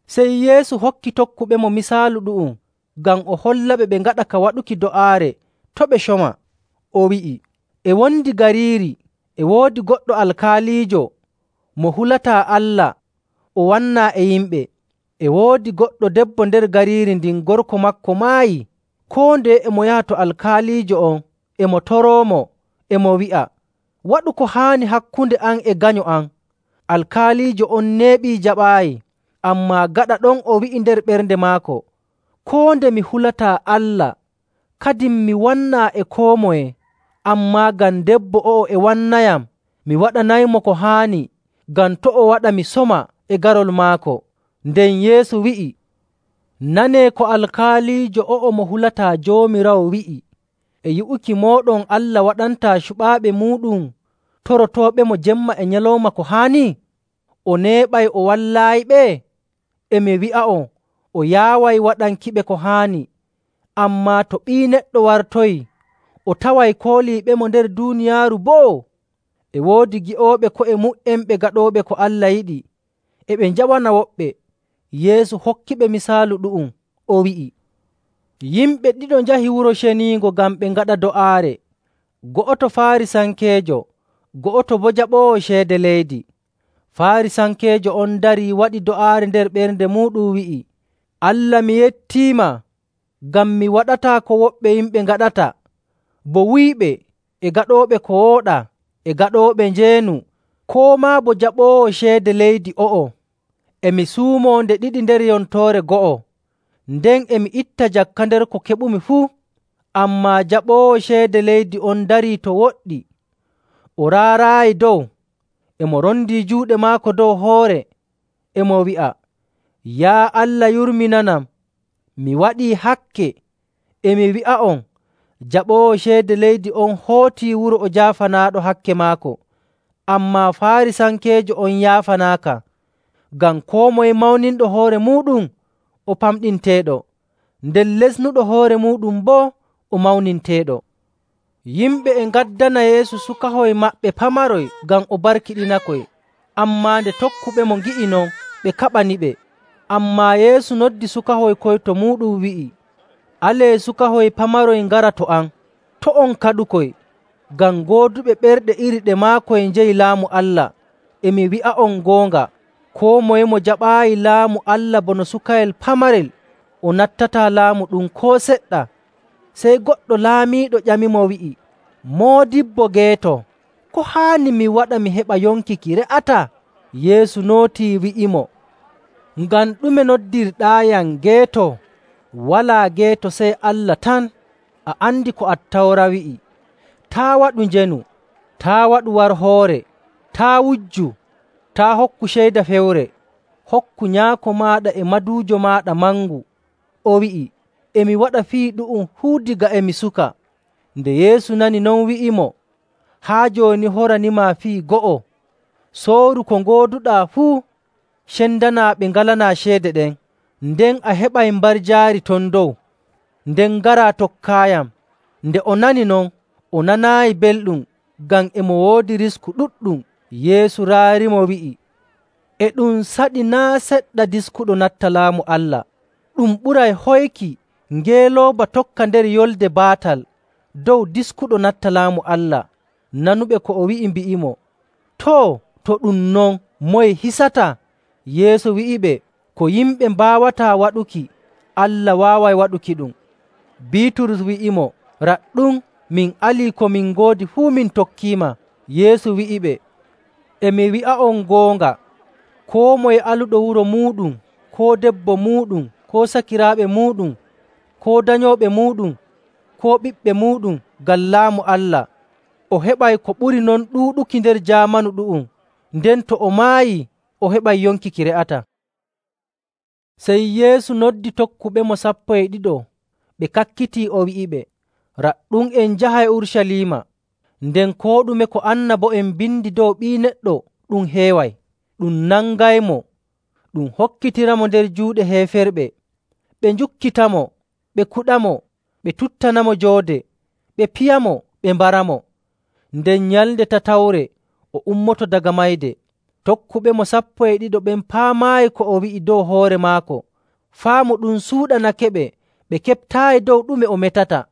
Sey Yeesu hokki tokkuɓemo misaalu ɗu'um ngam o hollaɓe ɓe ngaɗa ka waɗuki do'aare to' ɓe coma. O wi'i, “E wondi gariiri e woodi goɗɗo alkaaliijo mo hulataa Allah o wannaa e yimɓe. E woodi goɗɗo debbo nder gariiri ndin gorko maako maayi. Koo ndeye e mo yaha to alkaaliijo on e mo toroomo e mo wi'a, ‘Waɗu ko haani hakkunde am e ganyo am.’ Alkaaliijo on neeɓi jaɓaayi. Ammaa gaɗa ɗon o wi'i nder ɓernde maako, ‘Koo nde mi hulataa Allah, kadin mi wannaa e koo moye, ammaa ngam debbo o'o e wannayam, mi waɗanaymo ko haani, ngam to' o waɗa mi soma e garol maako.’” Nden Yeesu wi'i, “Nanee ko alkaaliijo o'o mo hulataa Joomiraawo wi'i. E yi'uki mooɗon Allah waɗantaa cuɓaaɓe muuɗum torotooɓemo jemma e nyalawma ko haani? O neeɓay o wallaayiɓe? E mi wi'a'on, o yaaway waɗankiɓe ko haani. Ammaa to Ɓii Neɗɗo wartoyii, o taway kooliiɓemo nder duuniyaaru boo?” E woodi ngi'ooɓe ko'e mu''en ɓe gaɗooɓe ko Allah yiɗi, e ɓe njawana woɓɓe. Yeesu hokkiɓe misaalu ɗu'um. O wi'i, “Yimɓe ɗiɗo njahi Wuro Ceniingo ngam ɓe ngaɗa do'aare, go'oto Faarisankeejo, go'oto boo jaɓoowo ceede leydi. Faarisankeejo on darii, waɗi do'aare nder ɓernde muuɗum wi'i, ‘Allah, mi yettiima ngam mi waɗataa ko woɓɓe yimɓe ngaɗata, bo wuyɓe, e gaɗooɓe ko wooɗaa, e gaɗooɓe njeenu, koo maa bo jaɓoowo ceede leydi o'o. E mi suumoo nde ɗiɗi nder yontoore go'o, nden e mi itta jakka nder ko keɓumi fuu.’ Ammaa jaɓoowo ceede leydi on darii to woɗɗi. O raaraayi dow, e mo rondi juuɗe maako dow hoore, e mo wi'a, ‘Yaa Allah, yurminanam, mi waɗii hakke.’ E mi wi'a'on, jaɓoowo ceede leydi on hootii wuro o jaafanaaɗo hakke maako, ammaa Faarisankeejo on yaafanaaka. Ngam koo moye mawninɗo hoore muuɗum o pamɗinteeɗo, nden lestinɗo hoore muuɗum boo o mawninteeɗo.”. Yimɓe e ngaddana Yeesu sukahoy maɓɓe pamaroy ngam o barkiɗinakoy, ammaa nde tokkuɓemo ngi'i non, ɓe kaɓaniɓe. Ammaa Yeesu noddi sukahoy koy to muuɗum, wi'i, “Alee sukahoy pamaroy ngara to am. To' on kaɗukoy, ngam gooduɓe ɓerɗe iri ɗe maakoy njeyi Laamu Allah. E mi wi'a'on goonga, koo moye mo jaɓaayi Laamu Allah bono sukayel pamarel, o nattataa laamu ɗum koo seɗɗa.” Sey goɗɗo laamiiɗo ƴamimo wi'i, “Moodibbo geeto, ko haani mi waɗa mi heɓa yonki ki re'ataa?” Yeesu nootii, wi'imo, “Ngam ɗume noddirɗaayam geeto? Walaa geeto sey Allah tan. A andi ko Attawra wi'i, ‘Taa' waɗu njeenu. Taa' waɗu warhoore. Taa' wujju. Taa' hokku ceyda fewre. Hokku nyaako maaɗa e maduujo maaɗa mangu.’”. O wi'i, “E mi waɗa fii ɗu'um fuu daga e mi suka.” Nde Yeesu nani non, wi'imo, “Haa jooni horanimaa fii go'o. Sooru ko ngooduɗaa fuu, cendanaa ɓe ngalanaa ceede ɗen, nden a heɓay mbarjaari ton dow. Nden ngaraa, tokkaayam.” Nde o nani non, o nanaayi belɗum, ngam e mo woodi risku ɗuɗɗum. Yeesu raarimo wi'i, “E ɗum saɗi naa' seɗɗa diskuɗo natta Laamu Allah! Ɗum ɓuray hoyki ngeelooba tokka nder yolnde baatal dow diskuɗo natta Laamu Allah.” Nanuɓe ko o wi'i mbi'imo, “Too, to ɗum non, moye hisata?” Yeesu wi'iɓe, “Ko yimɓe mbaawataa waɗuki, Allah waaway waɗukiɗum.” Biiturus wi'imo, “Raɗɗum, min alii ko min ngoodi fuu min tokkiima.” Yeesu wi'iɓe, “E mi wi'a'on goonga, koo moye aluɗo wuro muuɗum, koo debbo muuɗum, koo sakiraaɓe muuɗum, koo danyooɓe muuɗum, koo ɓiɓɓe muuɗum, ngam Laamu Allah, o heɓay ko ɓuri non ɗuuɗuki nder jaamanu ɗu'um, nden to o maayii o heɓay yonki ki re'ataa.” Sey Yeesu noddi tokkuɓemo sappo e ɗiɗo, ɓe kakkitii o wi'iɓe, “Raɗɗum, en njahay Urucaliima, nden koo ɗume ko annabo'en mbindi dow Ɓii Neɗɗo ɗum heeway. Ɗum nangaymo, ɗum hokkitiramo nder juuɗe heeferɓe, ɓe njukkitamo, ɓe kuɗamo, ɓe tuttanamo joode, ɓe piyamo, ɓe mbaramo. Nden nyalnde tatawre o ummoto daga mayde.” Tokkuɓemo sappo e ɗiɗo ɓen paamaayi ko o wi'i dow hoore maako. Faamu ɗum suuɗanakeɓe, ɓe keɓtaayi dow ɗume o metata.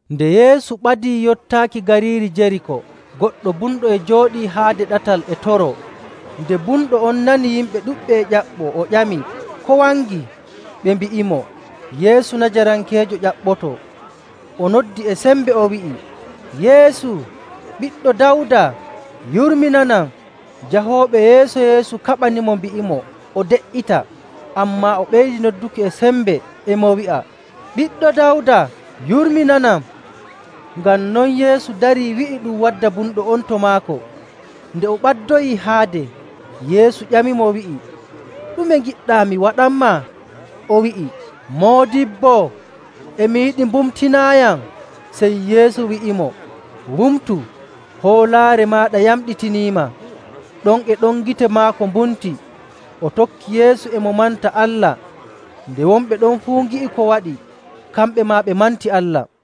Nde Yeesu ɓadii yottaaki gariiri Jeriiko, goɗɗo bumɗo e jooɗii haade ɗatal e toroo. Nde bumɗo on nani yimɓe ɗuɗɓe e ƴaɓɓoo, o ƴami, “Ko wangi?” Ɓe mbi'imo, “Yeesu Najarankeejo ƴaɓɓotoo.” O noddi e sembe, o wi'i, “Yeesu, Ɓiɗɗo Dawda, yurminanam!” Jahooɓe yeeso Yeesu kaɓanimo mbi'imo o de''ita, ammaa o ɓeydi nodduki e sembe, e mo wi'a, “Ɓiɗɗo Dawda, yurminanam!” Ngam non Yeesu darii wi'i ɗum wadda bumɗo on to maako. Nde o ɓaddoyii haade, Yeesu ƴamimo, wi'i, “Ɗume ngiɗɗaa mi waɗanmaa?” O wi'i, “Moodibbo, e mi yiɗi mbumtinaayam.” Sey Yeesu wi'imo, “Wumtu! Hoolaare maaɗa yamɗitiniima.” Ɗon e ɗon gite maako mbumti, o tokki Yeesu, e mo manta Allah. Nde wonɓe ɗon fuu ngi'i ko waɗi, kamɓe maa ɓe manti Allah.